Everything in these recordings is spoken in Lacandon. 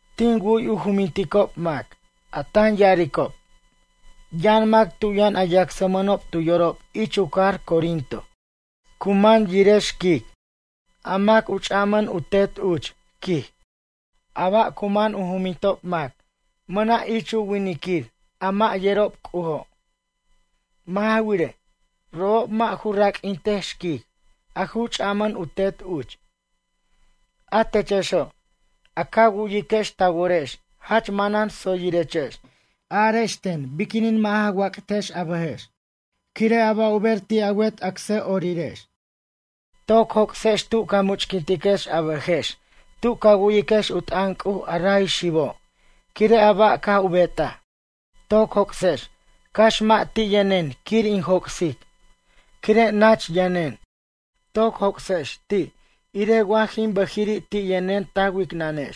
Tin wu'y u juminticob mac, a tan ya'aricob: “Yʌn mac tu' yʌn a yacsmʌnob tu yorob ich u cajar Corinto, cu man yire xquic, a mac u ch'amʌn u tet uch”, quij. A ba' cu man u jumintob mac mʌna' ich winiquir a mʌ' yerob C'ujo'. Mʌ' ja wirej, robob mʌ' ju raq'uintej xquic, a ju ch'amʌn u tet uch. A techexo', a ca wu'yiquex ta worex jach manan tsoyirechex, arex ten biquinin mʌ' ja wac't a bʌjex, quire' a ba' u ber ti' a wet acsa'orirex? Toc joc'sex tu ca much'quintiquex a bʌjex tu ca wu'yiquex u t'ʌn C'uj a ray xibo', quire' a ba' caj u betaj! Toc joc'sex cax mʌ' ti' yʌnen quir in joc'sic, quire' nach yʌnen. Toc joc'sex ti', irej wa jin bʌjiri' ti' yʌnen ta wicnʌnex.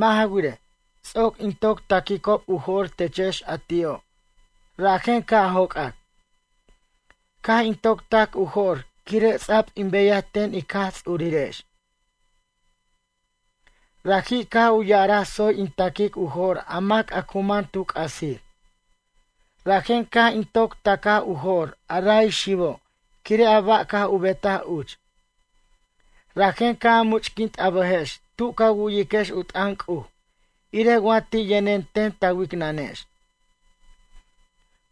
Mʌ' ja wirej, ts'oc in toc ta'quicob u jo'r techex a ti'o', rajen ca' joc'ac. Caj in toc tac u jo'r quire' ts'a'b in beyaj ten Ic Jaj Ts'urirex. Raji' caj u ya'araj tsoy in ta'quic u jo'r a mac a cu man tu c'asir. Rajen caj in toc ta'caj u jo'r a ray xibo' quire' a ba' caj u betaj uch. Rajen ca' a much'quint a bʌjex tu ca wu'yiquex u t'ʌn C'uj irej wa ti' yʌnen ten ta wicnʌnex.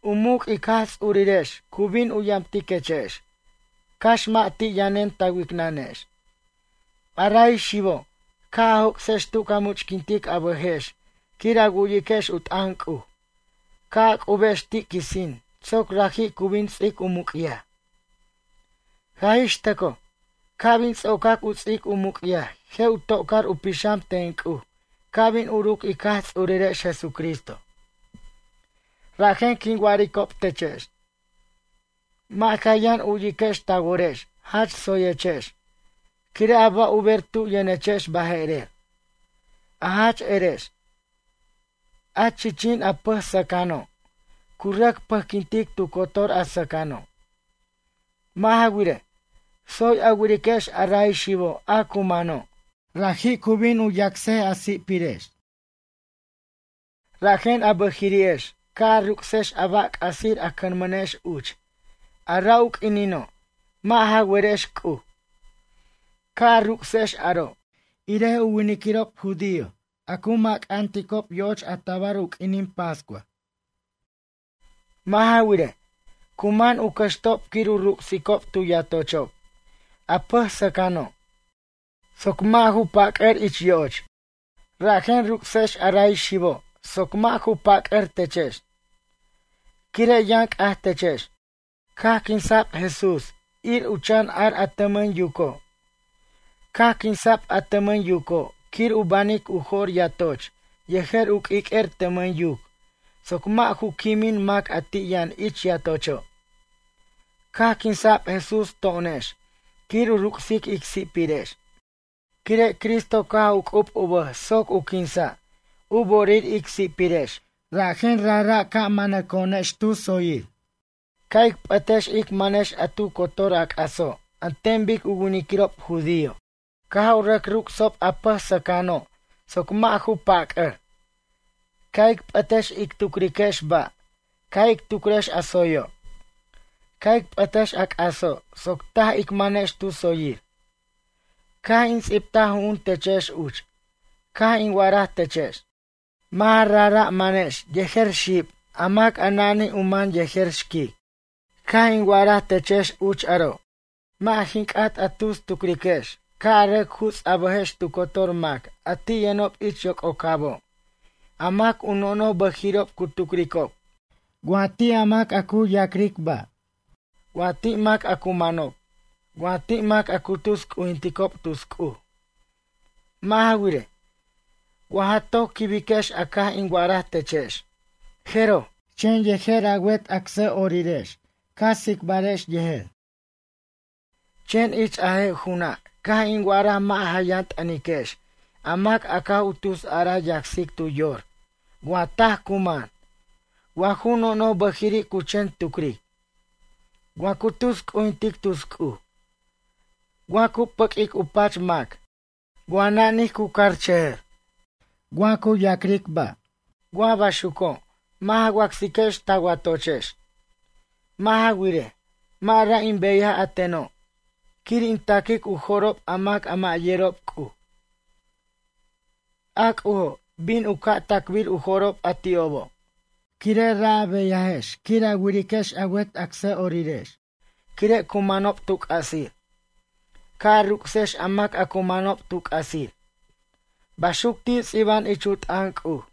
U muc' ic Jaj Tsurirex cu bin u yamtiquechex, cax mʌ' ti' yʌnen ta wicnʌnex. A ray xibo', ca' a joc'sex tu ca much'quintic a bʌjex quir a wu'yiquex u t'ʌn C'uj, ca' a c'ubex ti' quisin soc raji' cu bin ts'ic u muc'yaj. Jaj ix tʌcoj, ca' bin ts'ocac u ts'ic u muc'yaj je' u to'car u pixam ten C'uj ca' bin uruc ic Jaj Ts'urirex Jesucristo. Rajen quin wa'aricob techex. Mʌ' ja yʌn u'yiquex ta worex jach tsoyechex, quire' a ba' u ber tu' yʌnechex baje'rer. A jach erex: “A chichin a pʌj sʌcʌno', cu rʌc pʌjquintic tu cotor a sʌcʌno'.” Mʌ' ja wirej, tsoy a wiriquex a ray xibo' a cu mano', raji' cu bin yacs a si'pirex. Rajen a bʌjiri'ex ca' a ruc'sex a ba' c'asir a cʌnmʌnex uch, a ra' u quinino' mʌ' ja werex C'uj. Ca' a ruc'sex aro', irej u winiquirob judío a cu macanticob yo'och a tabar u q'uinin pascua. Mʌ' ja wirej, cu man u cʌxtob quir u ruc'sicob tu yatochob a pʌj sʌcʌno', soc mʌ' ju pac'ʌr ich yo'och. Rajen ruc'sex a ray xibo' soc mʌ' ju pac'ʌr techex. Quire' yʌn c'aj techex, caj quinsa'b Jesús ir u chan ar a tʌmʌn yuco'. Caj quinsa'b a tʌmʌn yuco' quir u banic u jo'r yatoch yejer u q'uiq'uer tʌmʌn yuc soc mʌ' ju quimin mac a ti' yʌn ich yatocho'. Caj quinsa'b Jesús to'onex quir u ruc'sic ic si'pirex. Quire' Cristo caj u c'ub u bʌj soc u quinsa', u bo'orir ic si'pirex rajen rajra' ca' manaco'onex tu tsoyir, ca' ic p'ʌtex ic manex a tu cotor a c'aso' an ten bic u winiquirob judío caj u rʌc ruc'sob a pʌj sʌcʌno', soc mʌ' ju pac'ʌr. Ca' ic p'ʌtex ic tucriquex ba', ca' ic tucrex a tsoyo'. Ca' ic p'ʌtex a c'aso' soc taj ic manex tu tsoyir. Caj in ts'ibtaj ju'un techex uch, caj in wa'araj techex: “Mʌ' ja rajra' manex yejer xib a mac a nanij u man yejer xquic.” Caj in wa'araj techex uch aro', mʌ' jin c'at a tus tucriquex ca' a rʌc juts a bʌjex tu cotor mac a ti' yʌnob ich yoc'ocabo', a mac u nonoj bʌjiri'ob cu tucricob, wa ti' a mac a cu ya'cric ba', wa ti' mac a cu manob, wa ti' mac a cu tus c'ujinticob tus c'uj. Mʌ' ja wirej, wa ja toc quibiquex a caj in wa'araj techex, jeroj, chen yejer a wet acsa'orirex ca tsicbarex yejer. Chen ich a je' ju'una', caj in wa'araj mʌ' ja yʌn t'ʌniquex a mac a caj u tus araj yacsic tu yor wa taj cu man, wa ju nonoj bʌjiri' cu chen tucric. Wa cu tus c'ujintic tus c'uj, wa cu pʌq'uic u pach mac, wa nanij cu carchʌjʌr, wa cu ya'cric ba'. Wa baxuco', mʌ' ja wacsiquex ta watochex. Mʌ' ja wirej, mʌ' ra' in beyaj a teno', quir in ta'quic u jo'rob a mac a mʌ' yerob C'uj. A C'ujo', bin u ca' ta'cbir u jo'rob a ti'obo'. Quire' ra' a beyajex quir a wiriquex a wet acsa'orirex quire' cu manob tu c'asir. Ca' a ruc'sex a mac a cu manob tu c'asir. Baxuc ti' ts'iba'an ich u t'ʌn C'uj.